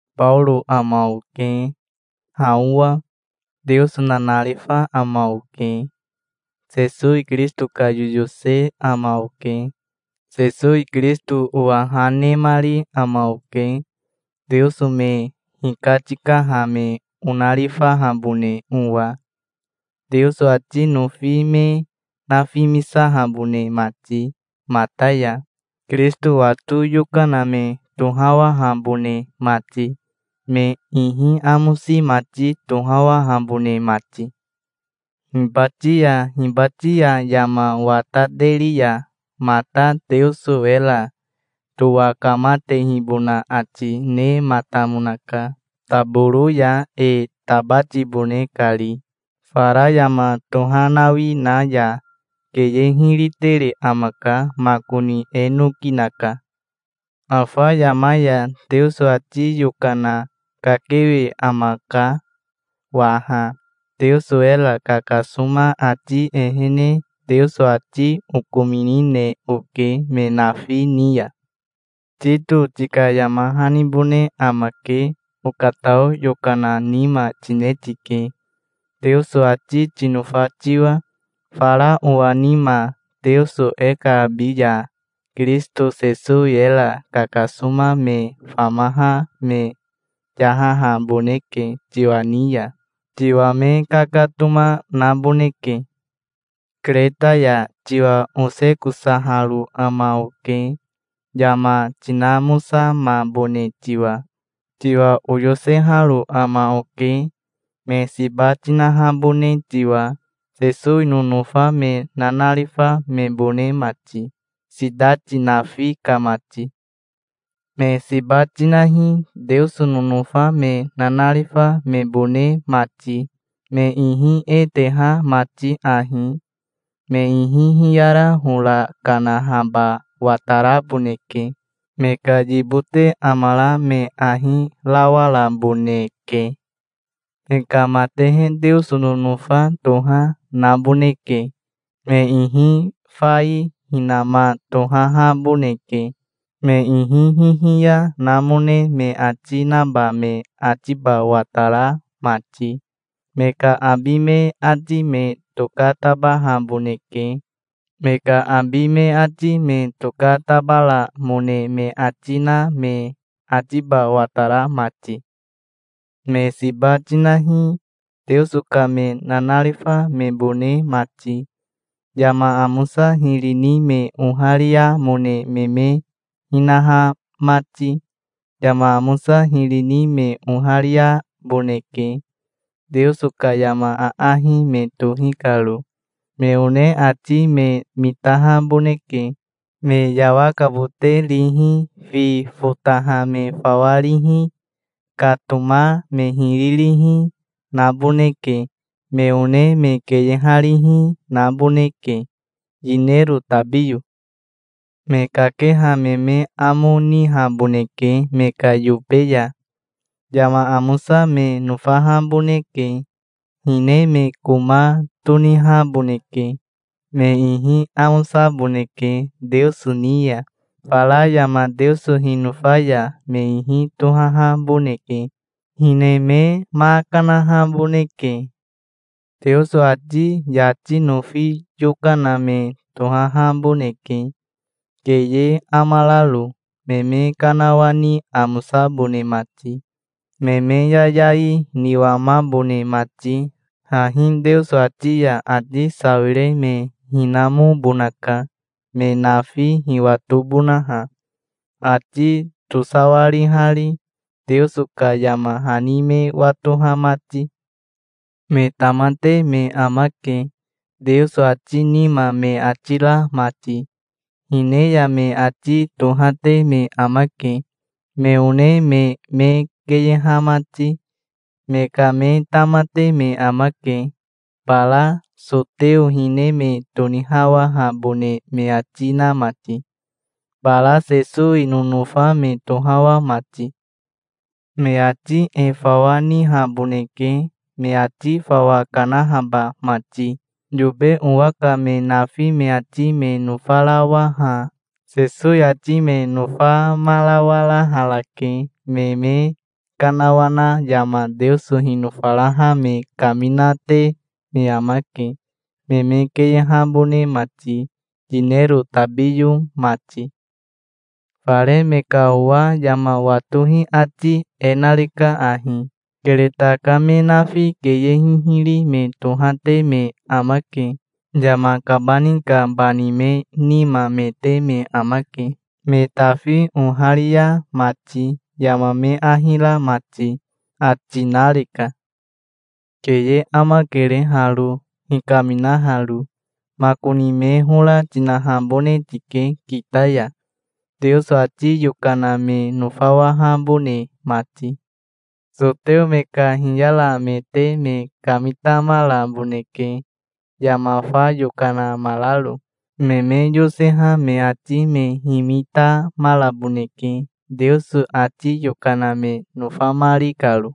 Baoro ama oke, ha owa. Teoso nanarifa ama oke. Sesowi Kirisito ka yoyose ama oke. Sesowi Kirisito owa ha nemari ama oke, Teoso me hikatikaha me onarifahabone owa, Teoso ati nofi me nafimisahabone mati mata ya, Kirisito wato yokana me tohawahabone mati, me ihi amosi mati tohawahabone mati. Hibati ya hibati ya yama watateri ya mata Teoso era towakamatehibona ati nematamonaka, taboro ya e tabatibone kari, fara yama tohanawi na ya. Keye hiri tere amaka. Makoni e noki naka. Afa yama ya Teoso ati yokana kakewe amaka waha. Teoso era kakasoma ati ehene Teoso ati okominine oke me nafi ni ya. Tito tika yama hanibone amake. Okatao yokana nima tine tike, Teoso ati tinofa tiwa, fara owa nima. Teoso e ka abi ya Kirisito Sesowi era kakasoma me famaha me yahahaboneke tiwa ni ya. Tiwa me kakatoma naboneke. Kereta ya tiwa osekosaharo ama oke, yama tinamosamabone tiwa. Tiwa oyoseharo ama oke, me siba tinahabone tiwa, Sesowi nonofa me nanarifa mebone mati, sitati nafi ka mati. Me siba tinahi, Teoso nonofa me nanarifa mebone mati, me ihi e teha mati ahi: me ihi hiyara hora kanahaba wataraboneke. Me ka yibote amara me ahi rawaraboneke. Me ka matehe Teoso nonofa toha naboneke. Me ihi fai hinama tohahaboneke, me ihi hihiya namone me ati naba me atiba watara mati. Me ka abi me ati me tokatabahaboneke, me ka abi me ati me tokatabaramone me ati na me atiba watara mati. Me siba tinahi, Teoso ka me nanarifa mebone mati, yama amosa hiri ni me ohariamone me me hinaha mati. Yama amosa hiri ni me ohariaboneke, Teoso ka yama aahi me tohi karo. Me one ati me mitahaboneke. Me yawakabote rihi, fi fotaha me fawa rihi, katoma me hiri rihi, naboneke. Me one me keyeharihi, naboneke, yinero tabiyo. Me kakeha me me amo nihaboneke me ka yobe ya. Yama amosa me nofahaboneke. Hine me koma tonihaboneke. Me ihi amosaboneke Teoso ni ya. Fara yama Teoso hinofa ya me ihi tohahaboneke. Hine me ma kanahaboneke. Teoso ati yati nofi yokana me tohahaboneke, keye amararo, me me kanawani amosabone mati, me me yayai niwamabone mati. Hahi Teoso ati ya ati sawire me hinamobonaka, me nafi hiwatobonaha, ati tosawarihari, Teoso ka yama hani me watoha mati. Me tamate me amake, Teoso ati nima me ati ra mati. Hine ya me ati tohate me amake, me one me me keyeha mati. Me ka me tamate me amake, bara soteo hine me tonihawahabone me ati na mati, bara Sesowi nonofa me tohawa mati. Me ati e fawa nihaboneke, me ati fawa kanahaba mati. Yobe owa ka me nafi me ati me nofarawaha Sesowi ati me nofamarawaraharake. Me me kanawana yama Teoso hinofaraha me kaminate me amake, me me keyehabone mati, yinero tabiyo mati. Fare me ka owa yama watohi ati e nareka ahi: "Kereta ka me nafi keye hihiri me tohate me amake. Yama kabani ka bani me nima me te me amake, me tafi oharia mati, yama me ahi ra mati", ati nareka. Keye amakere haro, hikaminaharo. Makoni me hora tinahabone tike kita ya, Teoso ati yokana me nofawahabone mati. Soteo me ka hiyaramete me kamitamaraboneke, yama fa yokana amararo. Me me yoseha me ati me himitamaraboneke, Teoso ati yokana me nofamari karo.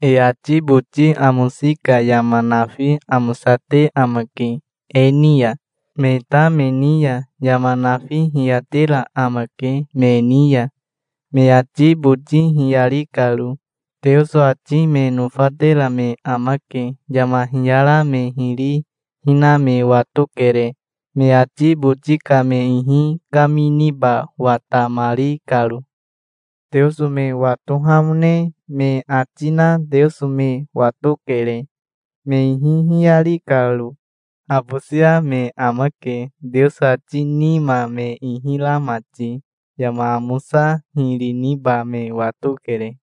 E ati boti amosi ka yama nafi amosate amake e ni ya. Me ta me ni ya yama nafi hiyatera amake me ni ya, me ati boti hiyari karo. Teoso ati me nofatera me amake. Yama hiyara me hiri hina me watokere, me ati boti ka me ihi kaminiba watamari karo. Teoso me watohamone me ati na Teoso me watokere, me ihi hiyari karo. Habosia me amake, Teoso ati nima me ihi ra mati. Yama amosa hiri niba me watokere.